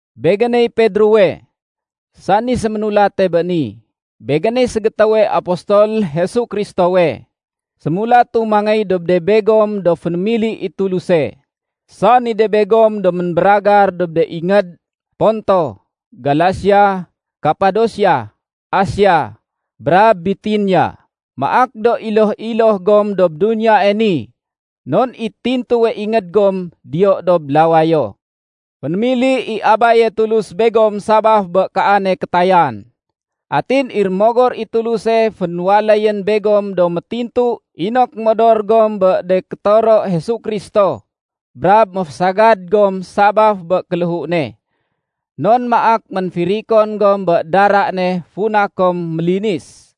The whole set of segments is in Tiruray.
Begéney Pedrowe, sani séménulate bé ni. Begéney ségétéwe apostol Jesu Kristowe. Sémulatu mangéy dob de begom do fénémili i Tuluse, sani de begom do ménbéragar dob de ingéd Ponto, Galasia, Kapadosia, Asia, brab Bitinia. Maak do iloh-iloh gom dob duniyae ni non i tintuwe ingéd gom diyo dob lawayo. Fénémili i Abaye Tulus begom sabaf bé kaane kétayan. Atin i Rémogor i Tuluse fénwaléyén begom do métintu inok modor gom bé de kétoro Jesu Kristo brab méfésagad gom sabaf bé kéléhu ne. Non maak ménfirikon gom bé dara ne funa kom mélinis.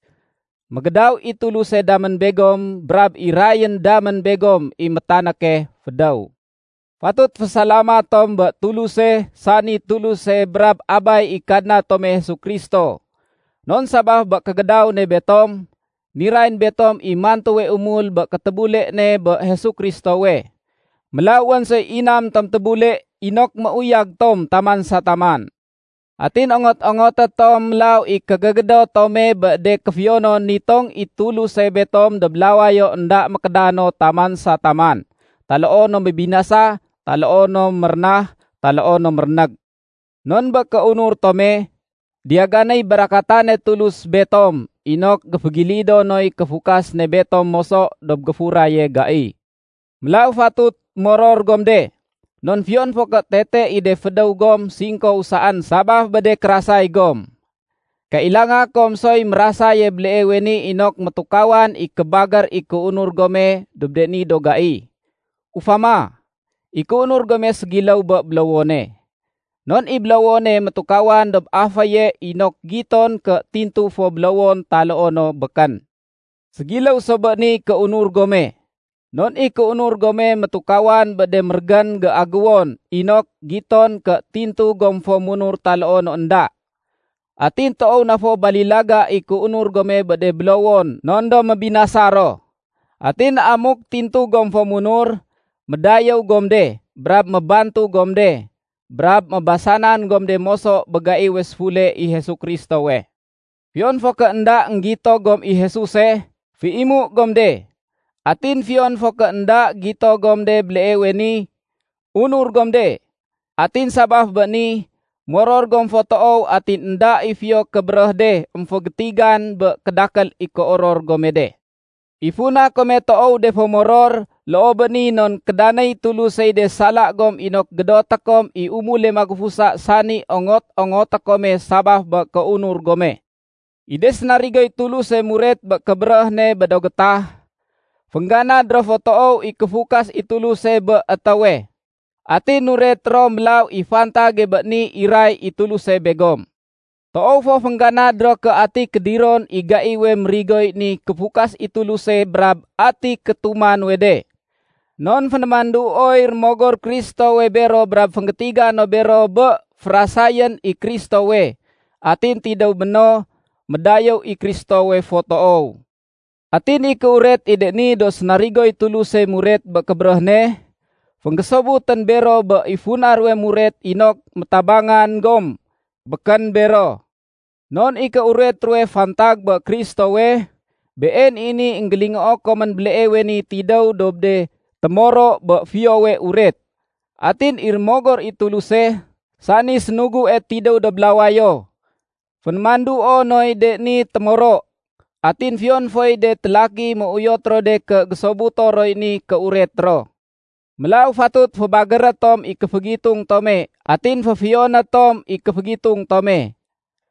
Mégédaw i Tuluse damén begom brab irayén damén begom i métanéke fédéw. Fatut fésalamat tom bé Tuluse sani Tuluse brab Abay i Kadna tome Jesu Kristo. Non sabaf bé kégédaw ne betom, nirayén betom i mantuwe umul bé kétébule ne bé Jesu Kristowe. Mélaw wén soy inam tom tébule inok méuyag tom taman sa taman. Atin ongot-ongoté tom mélaw i kégégédot tome bé de kéfiyonon nitong i Tuluse betom dob lawayo énda mékédano taman sa taman, taloo no mébinasa taloo no mérénah taloo no mérénég. Non bé kéunur tome, diyaganéy barakatane Tulus betom inok géfégilido noy kéfukas ne betom moso dob géfuraye gai. Mélaw fatut moror gom de, non fiyon fo ké tete i de fédéw gom singkow saén sabaf bé de kérasay gom, kailanga kom soy mérasaye béleewe ni inok métukawan i kébagér i kéunur gome dob de ni do gai. Ufama, i kéunur gome ségiléw bé bélowone. Non i bélowone métukawan dob aféye inok giton ké tintu fo bélowon taloo no békén. Ségiléw so bé niy kéunur gome. Non i kéunur gome métukawan bé de mérégén géagéwon inok giton ké tintu gom fo munur taloo no énda. Atin toow na fo balilaga i kéunur gome bé de bélowon non do mébinasa ro. Atin amuk tintu gom fo munur, médayéw gom de, brab mébantug gom de, brab mébasanan gom de moso bé gaiwe séfule i Jesu Kristowe. Fiyon fo ké énda énggito gom i Jesuse, féimu gom de. Atin fiyon fo ké énda gito gom de béleewe ni, unur gom de. Atin sabaf bé ni, moror gom fo toow atin énda i fiyo kébéréh de émfégétigan bé kédakél i kéoror gome de. I funa kome toow de fo moror loo bé ni non kédanéy Tulusey de sala gom inok gédoté kom i umule magufusa sani ongot-ongoté kome sabaf bé kéunur gome. I de sénarigoy Tuluse muret bé kébéréh ne bé do gétah, féngganad ro fo toow i kéfukas i Tuluse bé étéwe. Atin nuret ro mélaw i fantage bé ni iray i Tuluse begom. Toow fo féngganad ro ké ati kédiron i gaiwe mérigoy ni kéfukas i Tuluse brab ati kétuma nuwe de. Non fénémanduoy Rémogor Kristowe bero brab fénggétiga no bero bé férasayén i Kristowe, atin tidéw béno médayéw i Kristowe fo toow. Atin i kéuret i de ni do sénarigoy Tuluse muret bé kébéréh ne, fénggésobutén bero bé i funa ruwe muret inok métabangan gom, békén bero. Non i kéuret ruwe fantag bé Kristowe, been i ni énggélingoo komén béleewe ni tidéw dob de témoro bé Fiyowe Uret. Atin i Rémogor i Tuluse, sani sénugue tidéw dob lawayo, fénémanduo noy de ni témoro. Atin fiyon foy de télaki, méuyot ro de ké gésobuto roy ni kéuret ro. Mélaw fatut fébagéré tom i kéfégitung tome atin féfiyoné tom i kéfégitung tome.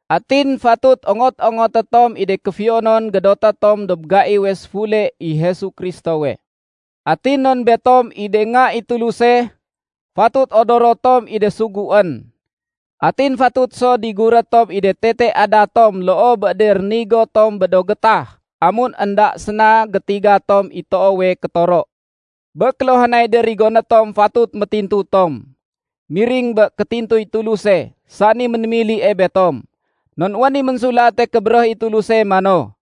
Atin fatut ongot-ongoté tom i de kéfiyonon gédoté tom dob gaiwe séfule i Jesu Kristowe. Atin non betom i de nga i Tuluse, fatut odoro tom i de suguén. Atin fatut so diguré tom i de tete adat tom loo bé de rénigo tom bé do gétah amun énda séna gétiga tom i toowe kétoro. Bé kéluhanay de rigoné tom fatut métintu tom, miring bé kétintuy Tuluse sani ménémilie betom. Non wén i Ménsulate Kébéréh i Tuluse mano,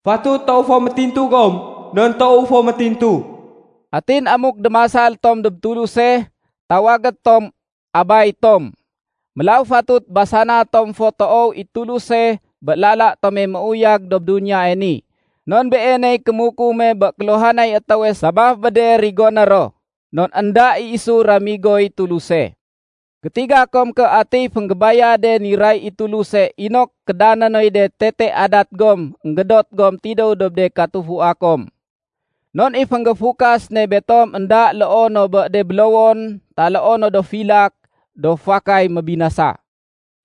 “Fatut toow fo métintu gom non toowu fo métintu.” Atin amuk démasal tom dob Tuluse, tawagé tom “Abay tom”, mélaw fatut basana tom fo toow i Tuluse bé lala tome méuyag dob duniyae ni. Non Beeney kémukume bé kéluhanay étéwe sabaf bé de rigoné ro, non énda i isu ramigoy Tuluse. Gétiga kom ké atiy fénggébayade niray i Tuluse inok kédané noy de tete adat gom énggédot gom tidéw dob de katufua kom. Non i fénggéfukas ne betom énda loo no bé de bélowon taloo no do filak do fakay mébinasa.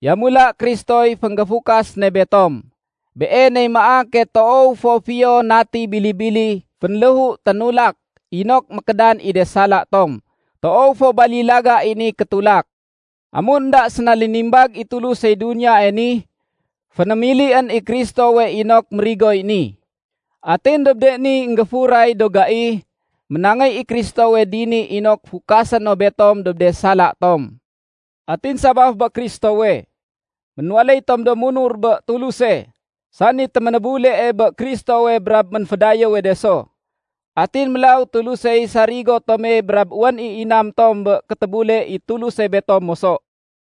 Yamula Kristoy fénggéfukas ne betom. Beeney maake toow fo fiyo nati bili-bili fénléhu ténulak inok mékédan i de sala tom. Toow fo balilaga i ni kétulak. Amun énda séna lénimbag i Tulusey duniyae ni, fénémilién i Kristowe inok mérigoy ni. Atin dob de ni énggéfuray do gai ménangéy i Kristowe dini inok fukasé no betom dob de sala tom. Atin sabaf bé Kristowe, ménwaléy tom do munur bé Tuluse, sani téménébulee bé Kristowe brab ménfédayéwe de so. Atin mélaw Tulusey sarigo tome brab wén i inam tom bé kétébule i Tuluse betom moso.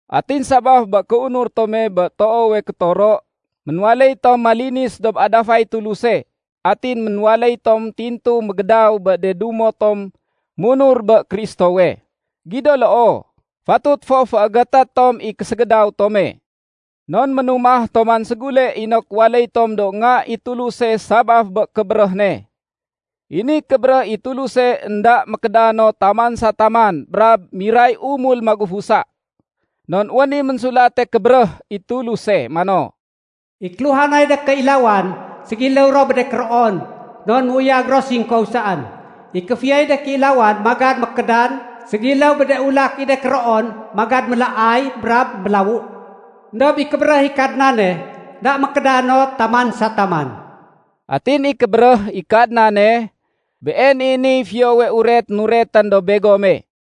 Atin sabaf bé kéunur tome bé toowe kétoro, ménwaléy tom malinis dob adafay Tuluse atin ménwaléy tom tintu mégédaw bé de dumo tom munur bé Kristowe. Gido loo, fatut fo féégété tom i késégédaw tome. Non ménumah tom man ségule inok waléy tom do nga i Tuluse sabaf bé kébéréh ne. I ni kébéréh i Tuluse énda mékédan no taman sa taman brab miray umul magufusa. Non wén i Ménsulate Kébéréh i Tuluse mano, “I kéluhanay de kéilawan ségiléw ro bé de kéroon, non méuyag ro singkow saén. I kéfiyoy de kéilawan magad mékédan ségiléw bé de ulak i de kéroon magad mélaay brab mélawu. Endob i kébéréh i Kadnane, énda mékédan no taman sa taman.” Atin i kébéréh i Kadnane, been i niy Fiyowe Uret nuretén dob begome.